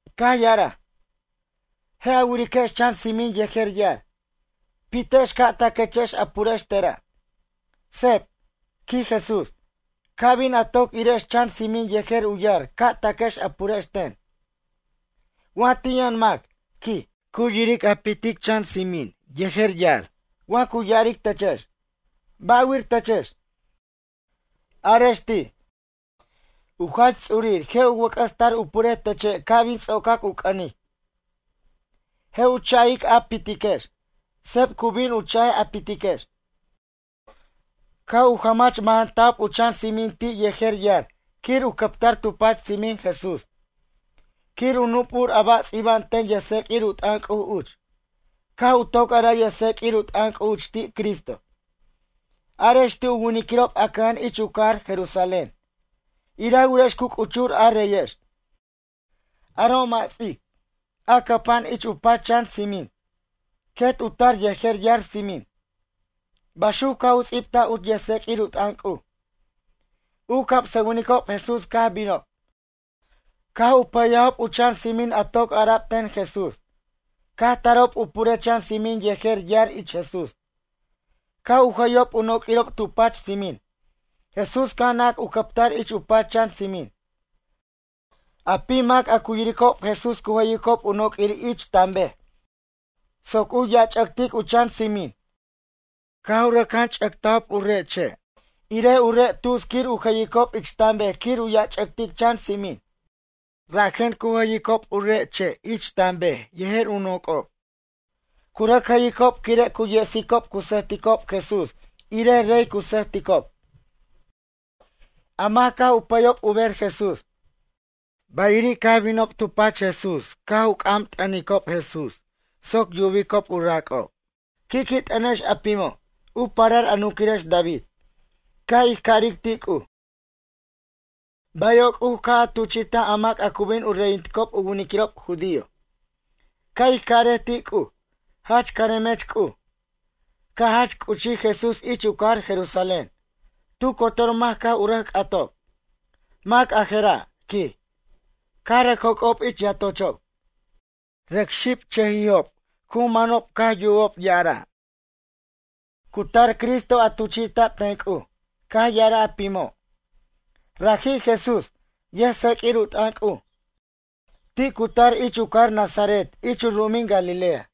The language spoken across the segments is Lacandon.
caj ya'araj: ―Je' a wiriquex chan tsimin yejer yar. Pitex ca' taquechex a purex tera'. Seb ―quij Jesús―, ca' bin a toc irex chan tsimin yejer u yar ca' taquex a purex ten. Wa ti' yʌn mac ―quij―. Cu yiric a pitic chan tsimin yejer yar. Wa cu ya'aric techex: “Ba'wir techex?” Arex ti': “U Jach Ts'urir je' u wʌc'ʌs tar u purej teche' ca' bin ts'ocac u c'ʌnic.” Je' u cha'ic a pitiquex. Seb cu bin u cha'ej a pitiquex. Caj u jamach mʌjanta'b u chan tsimin ti' yejer yar quir u cʌptar tu pach tsimin Jesús. Quir u nup'ur a ba' ts'iba'an ten yʌjtseq'uir u t'ʌn C'uj uch. Caj u toc araj yʌjtseq'uir u t'ʌn C'uj uch ti' Cristo. Arex ti' u winiquirob a cʌja'an ich u cajar Jerusalén: “Ira wirex cu c'uchur a reyex. Aro' mʌ' ts'ic, a cʌpa'an ich u pach chan tsimin. Quet u tar yejer yar tsimin.” Baxuc caj u ts'ibtaj uch yʌjtseq'uir u t'ʌn C'uj. U camsʌwinicob Jesús caj binob. Caj u pʌyajob u chan tsimin a toc ara'b ten Jesús. Caj tarob u purej chan tsimin yejer yar ich Jesús. Caj u jʌyob u noq'uirob tu pach tsimin. Jesús caj nac u cʌpʌtar ich u pach chan tsimin. A pim mac a cu yiricob Jesús cu jʌyicob u noq'uir ich tan bej soc u yach'ʌctic u chan tsimin. Caj u rʌc jan ch'ʌctajob u re' che' irej u re' tuts quir u jʌyicob ich tan bej quir u yach'tic chan tsimin. Rajen cu jʌyicob u re' che' ich tan bej yejer u noc'ob. Cu rʌc jʌyicob quire' cu yesicob cu sʌjticob Jesús irej rey cu sʌjticob. A mac caj u pʌyob u ber Jesús. Bayiri' caj binob tu pach Jesús caj u c'am t'ʌnicob Jesús soc yubicob u rac'ob: ―Qui' qui' t'ʌnex a pimo', u parar a nunquirex David. Ca' ij caric ti' C'uj: “Bayo' C'uj caj a tuchi'taj a mac a cu bin u reyinticob u winiquirob judío.” Ca' ij carej ti' C'uj: “Jach caremech C'uj.” Caj jach c'uchij Jesús ich u cajar Jerusalén. Tu cotor mac caj u rʌc c'atob: ―Mac a jera'? ―quij. Caj rʌc joc'ob ich yatochob. Rʌc xibche'chʌjijob cu manob caj yubob ya'araj: ―Cu tar Cristo a tuchi'ta'b ten C'uj. Caj ya'araj a pimo': ―Raji' Jesús, yʌjtseq'uir u t'ʌn C'uj. Ti' cu tar ich u cajar Nazaret ich u ru'umin Galilea.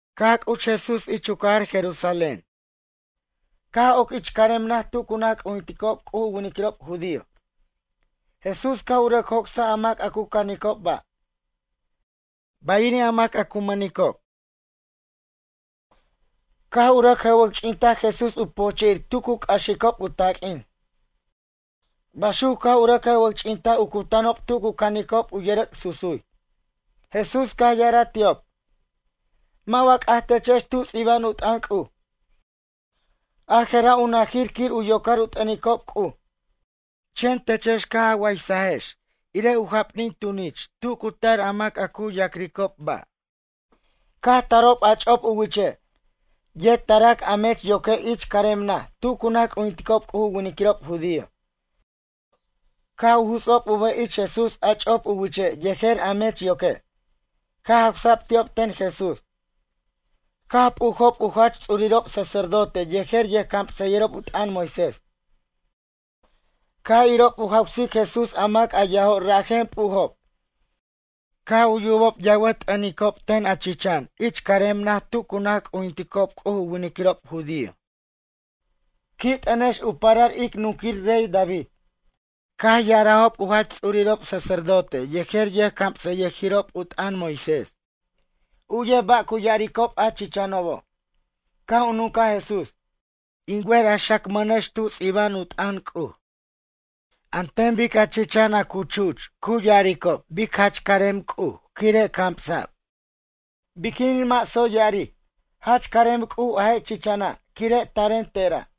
Caj c'uch Jesús ich u cajar Jerusalén, caj oc ich carem naj tu cu naj c'ujinticob C'uj u winiquirob judío. Jesús caj u rʌc joc'saj a mac a cu canicob ba'. Bayiri' a mac a cu mʌnicob, caj u rʌc jʌwʌc'ch'intaj Jesús u pojche'ir tu cu c'axicob u taq'uin. Baxuc caj u rʌc jʌwʌc'ch'intaj u cutanob tu cu canicob u yʌrʌc' susuy. Jesús caj ya'araj ti'ob: ―Mʌ' wa c'aj techex tu ts'iba'an u t'ʌn C'uj: “A jera' u najir quir u yocar u t'ʌnicob C'uj”, chen techex caj a waysajex irej u japnin tunich tu cu tar a mac a cu yac'ricob ba'. Caj tarob a ch'op u wiche', yet tarac a mech yoque' ich carem naj tu cu naj c'ujinticob C'uj u winiquirob judío. Caj u juts'ob u bʌj ich Jesús a ch'op u wiche' yejer a mech yoque'. Caj jawsa'b ti'ob ten Jesús. Caj p'ujob u jach ts'urirob sacerdote yejer yʌjcamsʌyʌjirob u t'ʌn Moisés. Caj irob u jawsic Jesús a mac yajo' rajen p'ujob. Caj yubob yawʌt t'ʌnticob ten a chichan ich carem naj tu cu naj c'ujinticob C'uj u winiquirob judío: “Qui' t'ʌnex u parar ic nunquir rey David.” Caj ya'arajob u jach ts'urirob sacerdote yejer yʌjcamsʌyʌjirob u t'ʌn Moisés: ―Uyej ba' cu ya'aricob a chichanobo'? Caj u nuncaj Jesús: ―In wer a xacmʌnex tub ts'iba'an u t'ʌn C'uj: An ten bic a chichan a cu chuch cu ya'aricob bic jach carem C'uj quire' camsa'b bayiri' a man jaca'ano'. Biquinin mʌ' tsoy ya'aric: Jach carem C'uj a je' chichana' quire' taren tera'?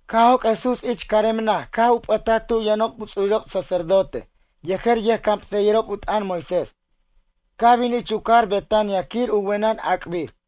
Caj joc' Jesús ich carem naj caj u p'ʌtaj tu yʌnob u ts'urirob sacerdote yejer yʌjcamsʌyʌjirob u t'ʌn Moisés. Caj bin ich u cajar Betania quir u wenʌn ac'bir.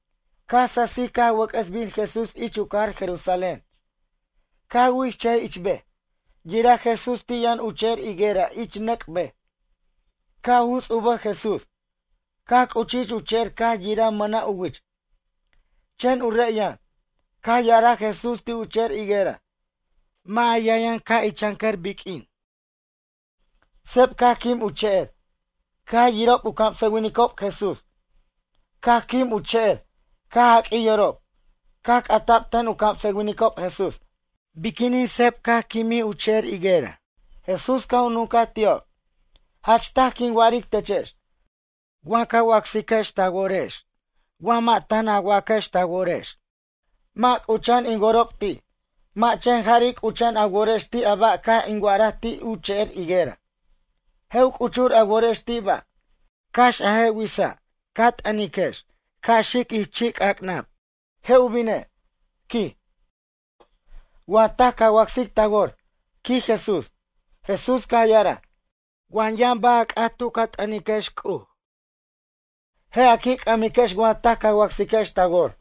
Caj sasij caj wʌc'ʌs bin Jesús ich u cajar Jerusalén. Caj wichʌjij ich bej. Yiraj Jesús ti' yʌn u che'er higuera ich nʌc' bej. Caj u juts' u bʌj Jesús. Caj c'uchij ich u che'er caj yiraj mʌna' u wich, chen u re' yʌn. Caj ya'araj Jesús ti' u che'er higuera: ―Mʌ' a yʌn yʌn ca' ichancʌr biq'uin. Seb caj quim u che'er. Caj yirob u camsʌwinicob Jesús, caj quim u che'er, caj jaq'uij yorob. Caj c'ata'b ten u camsʌwinicob Jesús: ―Biquinin seb caj quimin u che'er higuera? Jesús caj u nuncaj ti'ob: ―Jach taj quin wa'aric techex. Wa ca acsiquex ta worex wa mʌ' tan a waquex ta worex: “Mʌ' c'ucha'an in worob ti'.” Mʌ' chen jari' c'ucha'an a worex ti' a ba' caj in wa'araj ti' u che'er higuera. Je' u c'uchur a worex ti' ba'. Cax a je' witsa' ca t'ʌniquex ca' xic ich chi'c'ac'nab. Je' u bine' ―quij―, wa taj ca wacsic ta wor ―quij Jesús. Jesús caj ya'araj: ―Wa yʌn ba' a c'at tu ca t'ʌniquex C'uj. Je' a qui' c'ʌmiquex wa taj ca wacsiquex ta wor.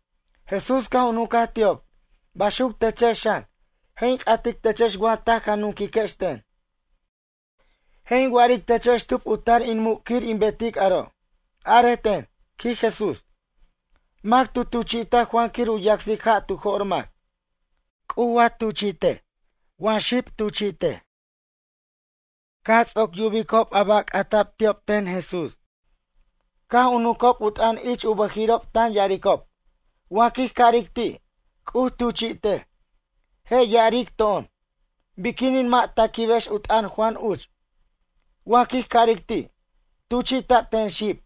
Jesús caj u nuncaj ti'ob: ―Baxuc techex xan, je' in c'atic techex wa taj ca nunquiquex ten. Je' in wa'aric techex tub u tar in muc' quir in betic aro'. Arej ten ―quij Jesús―. Mac tu tuchi'taj Juan quir u yacsic ja' tu jo'r mac. C'uj wa tuchi'tej wa xib tuchi'tej? Caj ts'oc yubicob a ba' c'ata'b ti'ob ten Jesús. Caj u nuncob u t'ʌn ich u bʌjirirob tan ya'aricob: ―Wa quij caric ti': “C'uj tuchi'tej”, je' ya'aric to'on: “Biquinin mʌ' ta quibex u t'ʌn Juan uch?” Wa quij caric ti': “Tuchi'ta'b ten xib,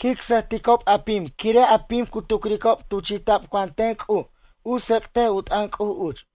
quic sʌjticob a pim quire' a pim cu tucricob tuchi'ta'b Juan ten C'uj u tsec'tej u t'ʌn C'uj uch.”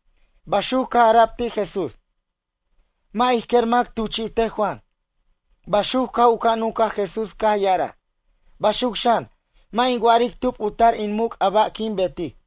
Baxuc caj ara'b ti' Jesús: ―Mʌ' ij quer mac tuchi'tej Juan. Baxuc caj u ca' nuncaj Jesús caj ya'araj: ―Baxuc xan, mʌ' in wa'aric tub u tar in muc' a ba' quin betic.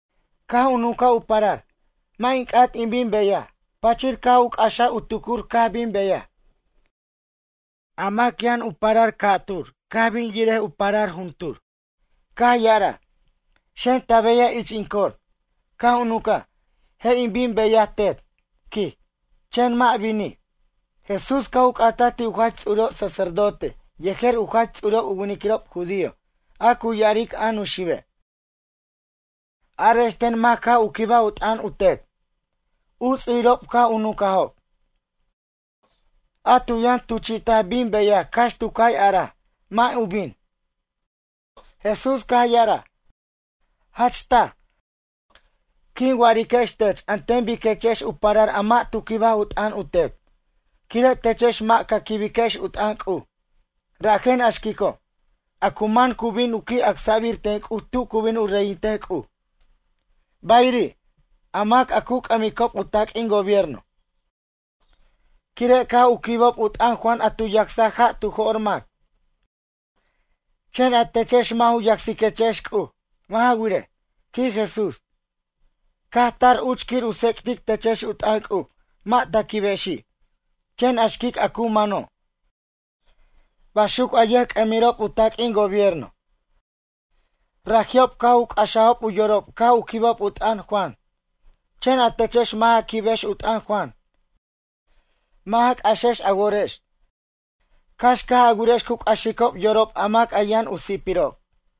Caj u nuncaj u parar: “Mʌ' in c'at in bin beyaj.” Pachir caj u c'axaj u tucur caj bin beyaj. A mac yʌn u parar ca'tur caj bin yirej u parar juntur. Caj ya'araj: “Xen ta beyaj ich in cor.” Caj u nuncaj: “Je' in bin beyaj Tet”, quij. Chen mʌ' binij. Jesús caj u c'ataj ti' u jach ts'urirob sacerdote yejer u jach ts'urirob u winiquirob judío a cu ya'aric a Nuxibe': ―Arex ten mac caj u quibaj u t'ʌn u tet? U ts'urirob caj u nuncajob: ―A tu yʌn tuchi't'aj bin beyaj cax tu cay araj: “Mʌ' u bin.” Jesús caj ya'araj: ―Jach taj, quin wa'ariquex tech an ten biquechex u parar a mʌ' tu quibaj u t'ʌn u tet. Quire' techex mʌ' ca quibex u t'ʌn C'uj. Rajen a xquico' a cu man cu bin qui' acsa'bir ten C'uj tu cu bin u reyintej C'uj. Bayiri', a mac a cu c'ʌmicob u taq'uin gobierno, quire' caj u quibob u t'ʌn Juan a tu yacsaj ja' tu jo'r mac. Chen a techex mʌ' u yacsiquechex C'uj. Mʌ' ja wirej ―quij Jesús―. Caj tar uch quir u tsec'tic techex u t'ʌn C'uj mʌ' ta quibexi'. Chen a xquic a cu mano', baxuc a yʌjc'ʌmirob u taq'uin gobierno, raji'ob caj u c'axajob u yorob caj u quibob u t'ʌn Juan. Chen a techex mʌ' ja quibex u t'ʌn Juan mʌ' ja c'axex a worex cax caj a wirex cu c'axicob yorob a mac yʌn u si'pirob.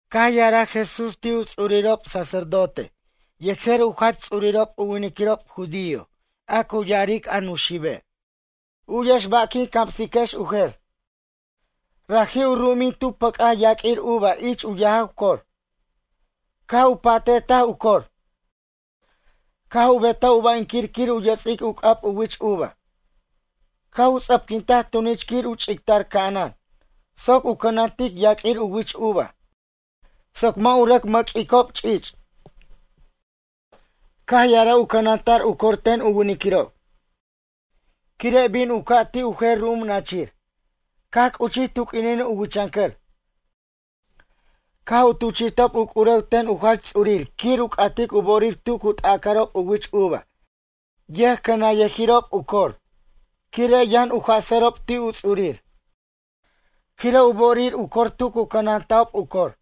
Caj ya'araj Jesús ti' u ts'urirob sacerdote yejer u jach ts'urirob u winiquirob judío a cu ya'aric a Nuxibe': ―U'yex ba' quin camsiquex u jer. Raji' u ru'umin tu tu pʌc'aj yaq'uir uva ich u yajaw cor. Caj u pa'te'taj u cor. Caj u betaj u ba'inquir quir u yʌts'ic u c'ab u wich uva. Caj u ts'ʌpquintaj tunich quir u ch'ictar ca'anan soc u cʌnantic yaq'uir u wich uva soc mʌ' u rʌc mʌq'uicob ch'ich'. ’Caj ya'araj u cʌnanta'r u cor ten u winiquirob. Quire' bin u ca' ti' u jer ru'um nachir. Caj c'uchij tu q'uinin u wichʌncʌr, caj tuchi'tob u c'urew ten u jach ts'urir quir u c'atic u bo'orir tu cu t'aca'rob u wich uva yʌjcʌnanyʌjirob u cor. Quire' yʌn u jasʌrob ti' u ts'urir, quire' u bo'orir u cor tu cu cʌnanta'ob u cor.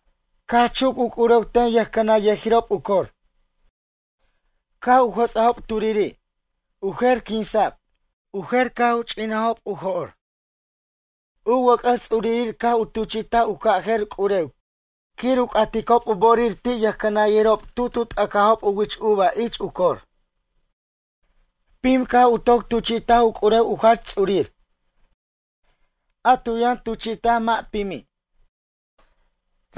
Caj chuc u c'urew ten yʌjcʌnanyʌjirob u cor. Caj u jʌts'ajob turiri', u jer quinsa'b. U jer caj u ch'inajob u jo'r. U wʌc'ʌs ts'urir caj u tuchi'taj u ca' jer c'urew quir u c'aticob u bo'orir ti' yʌjcʌnanyʌjirob tu tu t'acajob u wich uva ich u cor. Pim caj u toc tuchi'taj u c'urew u jach ts'urir. A tu yʌn tuchi'taj mʌ' pimi'.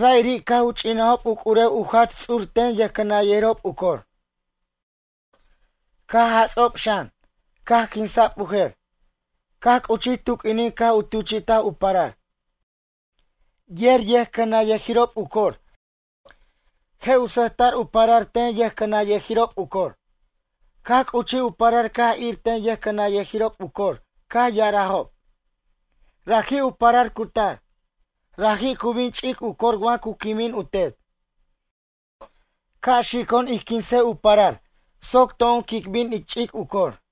Ra'iri' caj u ch'inajob u c'urew u jach ts'ur ten yʌjcʌnanyajirob u cor. Caj jats'ob xan, caj quinsa'b u jer. ’Caj c'uchij tu q'uinin caj u tuchi'taj u parar. Yer yʌjcʌnanyʌjirob u cor je' u sʌjta'r u parar ten yʌjcʌnanyʌjirob u cor. Caj c'uchij u parar caj ir ten yʌjcʌnanyʌjirob u cor caj ya'arajob: “Raji' u parar cu tar. Raji' cu bin ch'ic u cor wa cu quimin u tet. Ca' xico'on ij quinsej u parar soc to'on quic bin ic ch'ic u cor.”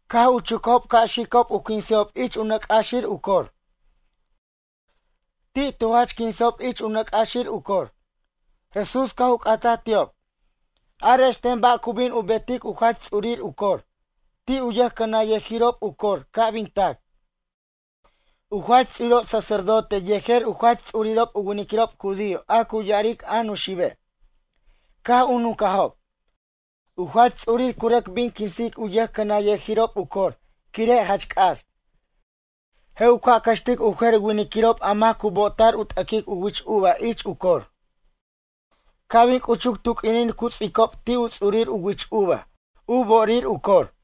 Caj u chucajob ca' xicob u quinsejob ich u nʌc' c'axir u cor. Ti' tu jach quinsajob ich nʌc' c'axir u cor. Jesús caj u c'ataj ti'ob: ―Arex ten ba' cu bin u betic u jach ts'urir u cor ti' u yʌjcʌnanyʌjirob u cor ca' bin tac? U jach ts'urirob sacerdote yejer u jach ts'urirob u winiquirob judío a cu ya'aric a Nuxibe' caj u nuncajob: ―U jach ts'urir cu rʌc bin quinsic u yʌjcʌnanyʌjirob u cor quire' jach c'as. Je' u ca' cʌxtic u jer winiquirob a mac cu bo'ota'r u t'aquic u wich uva ich u cor. Ca' bin c'uchuc tu q'uinin cu ts'icob ti' u ts'urir u wich uva u bo'orir u cor.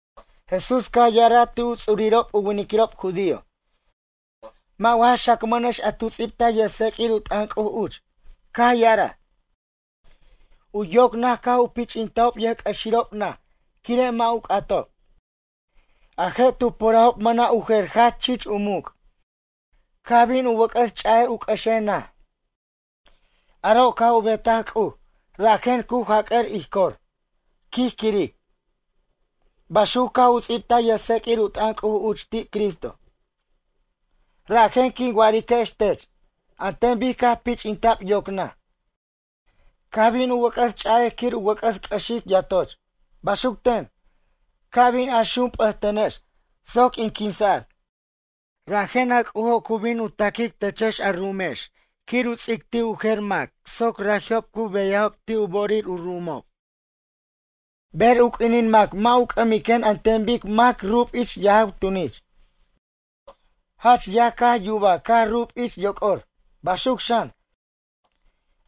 Jesús caj ya'araj ti' u ts'urirob u winiquirob judío: ―Mʌ' wa ja xacmʌnex a tu ts'ibtaj yʌjtseq'uir u t'ʌn C'uj uch caj ya'araj: U yoc naj caj u pich'intajob yʌjc'ʌxirob naj quire' mʌ' u c'atob. A je' tu purajob mʌna' u jer jach chich u muc'. Caj bin u wʌc'ʌs ch'a'ej u c'ʌxej naj. Aro' caj u betaj C'uj rajen cu jac'ʌr ij cor, quij quiric. Baxuc caj u ts'ibtaj yʌjtseq'uir u t'ʌn C'uj uch ti' Cristo. ’Rajen quin wa'ariquex tech, an ten bic caj pich'ta'b yoc naj, caj bin u wʌc'ʌs ch'a'ej quir u wʌc'ʌs c'ʌxic yatoch. Baxuc ten, ca bin a xump'ʌtenex soc in quinsa'r. Rajen a C'ujo cu bin u taquic techex a ru'umex quir u ts'ic ti' u jer mac soc raji'ob cu qui' beyajob ti' u bo'orir u ru'umob. Ber u q'uinin mac mʌ' u c'amiquen an ten bic mac rub ich yajaw tunich. Jach yaj caj yubaj caj rub ich yoc'or. Baxuc xan,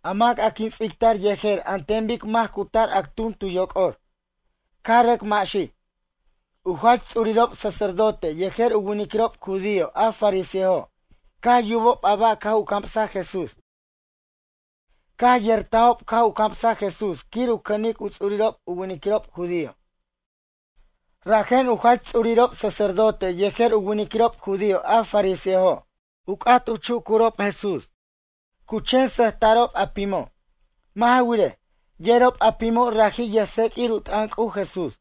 a mac a quin ts'ictar yejer an ten bic mac cu tar actun tu yocor, caj rʌc maxij. U jach ts'urirob sacerdote yejer u winiquirob judío a fariseojo' caj yubob a ba' caj u camsaj Jesús. Caj yertajob caj u camsaj Jesús quir u cʌnic u ts'urirob u winiquirob judío. Rajen u jach ts'urirob sacerdote yejer u winiquirob judío a fariseojo' u c'at chucurob Jesús. Cu chen sʌjta'rob a pimo'. Mʌ' ja wirej, yerob a pimo' raji' yʌjtseq'uir u t'ʌn C'uj Jesús.